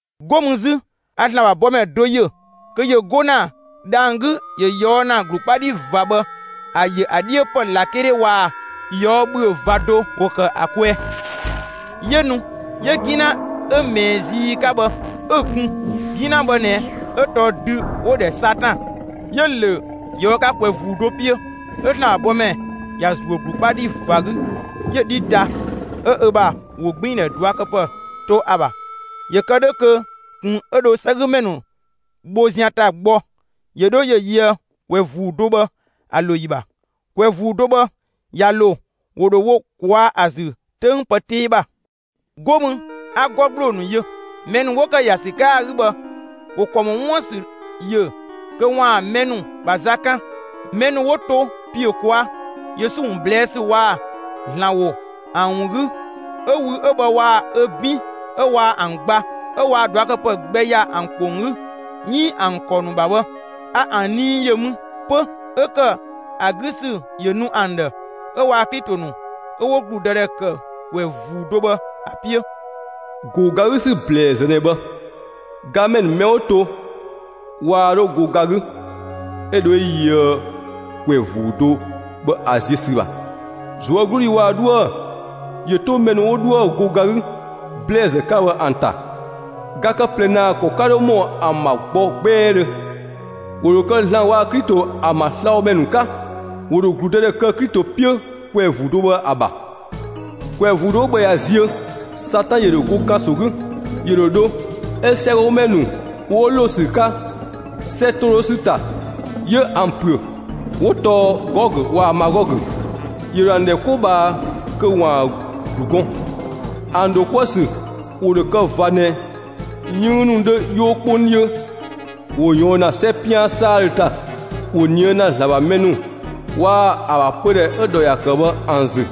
'Go mü 'zü a ‑Zlan ‑bha bɔmɛ do ‑yö kö ‑yö 'go ‑na dhang‑ 'gü ‑yö ꞊yɔɔ' ‑na; ‑glu 'kpa 'dhi ꞊va bhë, ‑a ‑yö ‑a 'dhiö ‑pë ꞊lakele waa‑ ꞊yɔɔ' ‑bhüö ꞊va do ‑wo ‑kë ‑a kwɛɛ. 'Yö nu 'yö 'gina 'ö ꞊mɛɛ zii 'ka bhë, 'ö‑ kun. 'Gina bhë ꞊nɛ 'ö tɔɔ dü 'wo‑ ‑dhɛ Satan. 'Yö‑ ‑lö ꞊yɔɔ' 'ka ‑kwɛ ‑vuu do 'piö. 'Ö ‑Zlan ‑bha bɔmɛ ‑ya ‑zuö ‑glu 'kpa 'dhi ꞊va 'gü, 'yö‑ 'dhi ta, 'ö ö ‑bha ‑wogbiindhɛ ꞊duakëpë to ‑a ‑bha, ‑yö kë 'dhö kö ꞊kun 'ö dho 'sɛgümɛ ‑nu bho zian ‑ta gbɔ ‑yö 'dho ‑yö yöë ‑kwɛ ‑vuu do bhë ‑a ‑lo ‑yi ‑bha. ‑Kwɛ ‑vuu do bhë ꞊ya ‑lo, ‑wo ‑dho wo ꞊kwaa'‑ ‑a ‑zü 'töng pë 'tee ‑bha. 'Go mü 'a 'gɔ ‑gbloo ‑nu yö: Mɛ ‑nu 'wo ‑kë ‑ya ‑sü 'ka ‑a 'gü bhë ‑wo ‑kɔ ‑mɔ 'wuën‑ ‑sü yö kö ‑waan mɛ ‑nu ‑bha za 'kan. Mɛ ‑nu 'wo to ‑piö ꞊kwaa' Yesu ‑wun ꞊blɛɛ' ‑sü waa‑ ‑Zlan ‑wo ‑an ‑wun 'gü, 'ö wü 'ö bhë waa‑ ‑a 'bin 'ö waa ‑an gba, 'ö waa ꞊duakëpë gbɛ ‑ya ‑an ‑kpong 'gü 'iin ‑an ‑kɔ ‑nu ‑bha bhë, a ‑an nii ‑yö mü 'pö, 'ö ‑kë ‑a 'gü ‑sü ‑yö nu ‑an ‑dhë, 'ö waa‑ Klito ‑nu 'ö 'wo ‑gludëdhɛ ‑kë ‑kwɛ ‑vuu do bhë ‑a 'piö. ‑Go ga 'gü ‑sü ‑blɛɛzë ꞊nɛ bhë. Gamɛ ‑nu mɛ 'wo to waa 'dho go ga 'gü 'ö dho 'ö yöë ‑kwɛ ‑vuu do bhë ‑a ziö ‑sü ‑bha. ꞊Zuögludhi waa‑ 'dhoë‑ ‑yö 'to mɛ ‑nu 'wo 'dhoë‑ go ga 'gü ‑blɛɛzë 'ka bhë ‑an ‑ta! Ga kë ꞊plɛ ‑naa ‑kɔ 'ka 'dho ‑mɔ ‑an ‑bha gbɔ 'gbɛɛdhö. ‑Wo ‑dho kë ‑Zlan waa‑ Klito ‑an ‑bha slabhomɛ ‑nu 'ka. ‑Wo ‑dho ‑gludëdhɛ kë Klito 'piö ‑kwɛ ‑vuu do bhë ‑a ‑bha. ‑Kwɛ ‑vuu do 'ö bhë ꞊ya ziö, Satan ‑yö ‑dho go ‑kanso 'gü. ‑Yö ‑dho dho 'ö 'sɛgɔgümɛ ‑nu 'wo ‑lo ‑sü 'ka 'sɛ ‑to 'dhö ‑sü ‑ta, 'yö ‑an ‑püö; 'wo tɔɔ Gɔgö waa‑ Magɔgö. ‑Yö ‑dho ‑an ‑dhɛ 'ko ꞊bhaa kö ‑waan ‑glu gɔn; ‑an ‑dho 'kuë‑ ‑sü ‑wo ‑dho kë ꞊va ꞊nɛ 'yënng ‑nu 'dhö 'yoo 'kpong 'dhiö. ‑Wo ꞊yɔɔn ‑na 'sɛ 'pian 'saadhö ‑ta; ‑wo ꞊nië' ‑na ‑Zlan ‑bha mɛ ‑nu waa‑ ‑a ‑bha pödhɛ 'ö‑ ‑dhɔ ‑ya ‑kë bhë ‑an ‑zü.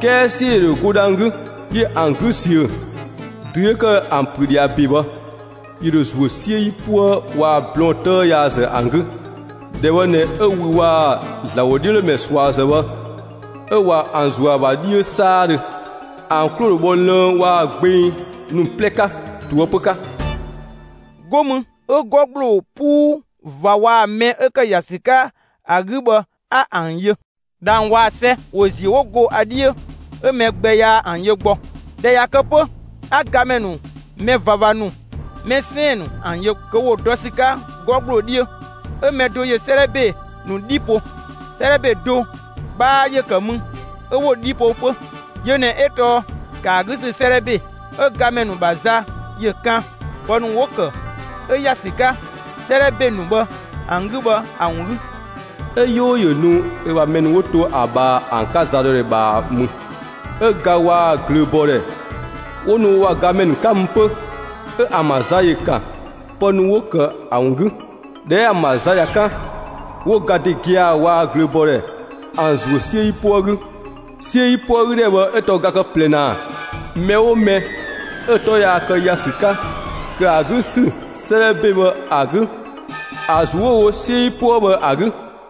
'Kɛɛ 'siö ‑yö ‑dho go dhang‑ 'gü, 'yö ‑an 'gü ‑siö. Dü 'yö ‑kë ‑an ‑püö ꞊dhia ‑be bhë, ‑yö ‑dho ‑zuö 'siö 'yipuë waa‑ blɔɔn 'tëë yaazë ‑an 'gü; ‑dhɛ bhë ꞊nɛ 'ö wü waa‑ ‑Zlan ‑wodhiölomɛ ꞊suazë bhë 'ö ꞊wa ‑an ‑zuö ‑a ‑bha 'dhiö 'saadhö. ‑An 'klo ‑dho bhɔ lënng waa‑ gbeng ‑nu 'plɛ 'ka ꞊toëpö 'ka. 'Go mü 'ö 'gɔ ‑gbloo 'puu ꞊va waa‑ mɛ 'ö ‑kë ‑ya ‑sü 'ka ‑a 'gü bhë 'a ‑an yö. 'Sɛ waa‑ dhang‑ ‑wo ‑ziö 'wo go ‑a 'dhiö, 'ö mɛ gbɛ yaa ‑an yö gbɔ. ꞊Dhɛ ꞊ya kë 'pö, 'a gamɛ ‑nu, mɛ ꞊vava ‑nu, mɛ 'sɛɛn‑ ‑nu ‑an yö kö ‑wo dɔ ‑sü 'ka 'gɔ ‑gbloo 'dhiö. 'Ö mɛ do ‑yö 'sëëdhɛ ‑be ‑nu 'dhi ‑po. 'Sëëdhɛ ‑be do 'bhaa ‑yö ‑kë mü 'ö 'wo‑ 'dhi po 'pö. Yö ꞊nɛ 'ö tɔɔ ‑kë ‑a 'gü ‑sü 'sëëdhɛ ‑be. 'Ö gamɛ ‑nu ‑bha za ‑yö ‑kan pë ‑nu 'wo‑ ‑kë, 'ö ‑ya ‑sü 'ka 'sëëdhɛ ‑be ‑nu bhë ‑an 'gü bhë ‑a ‑wun 'gü. 'Ö 'yoo ‑yö nu ö ‑bha mɛ ‑nu 'wo to ‑a ꞊bhaa ‑an 'ka za dɔ ‑dhɛ ꞊bhaa mü. 'Ö ga waa‑ ꞊glööbɔɔdhɛ 'wo nu wo ‑bha gamɛ ‑nu 'ka mü 'pö. 'Ö ‑an ‑bha za ‑yö ‑kan pë ‑nu 'wo‑ kë ‑a ‑wun 'gü. ꞊Dhɛ 'ö ‑an ‑bha za ꞊ya 'kan, 'wo ga ‑de gia‑ waa‑ ꞊glööbɔɔdhɛ ‑an ‑zuö 'siö 'yipuë 'gü. 'Siö 'yipuë 'gü ‑dhɛ bhë 'ö tɔɔ ga ‑kë ꞊plɛ ‑naa. Mɛ 'oo mɛ 'ö‑ 'tɔ yaa kë ‑ya ‑sü 'ka ‑kë ‑a 'gü ‑sü 'sëëdhɛ ‑be bhë ‑a 'gü, ‑a ‑zuö 'wo‑ wo 'siö 'yipuë bhë ‑a 'gü.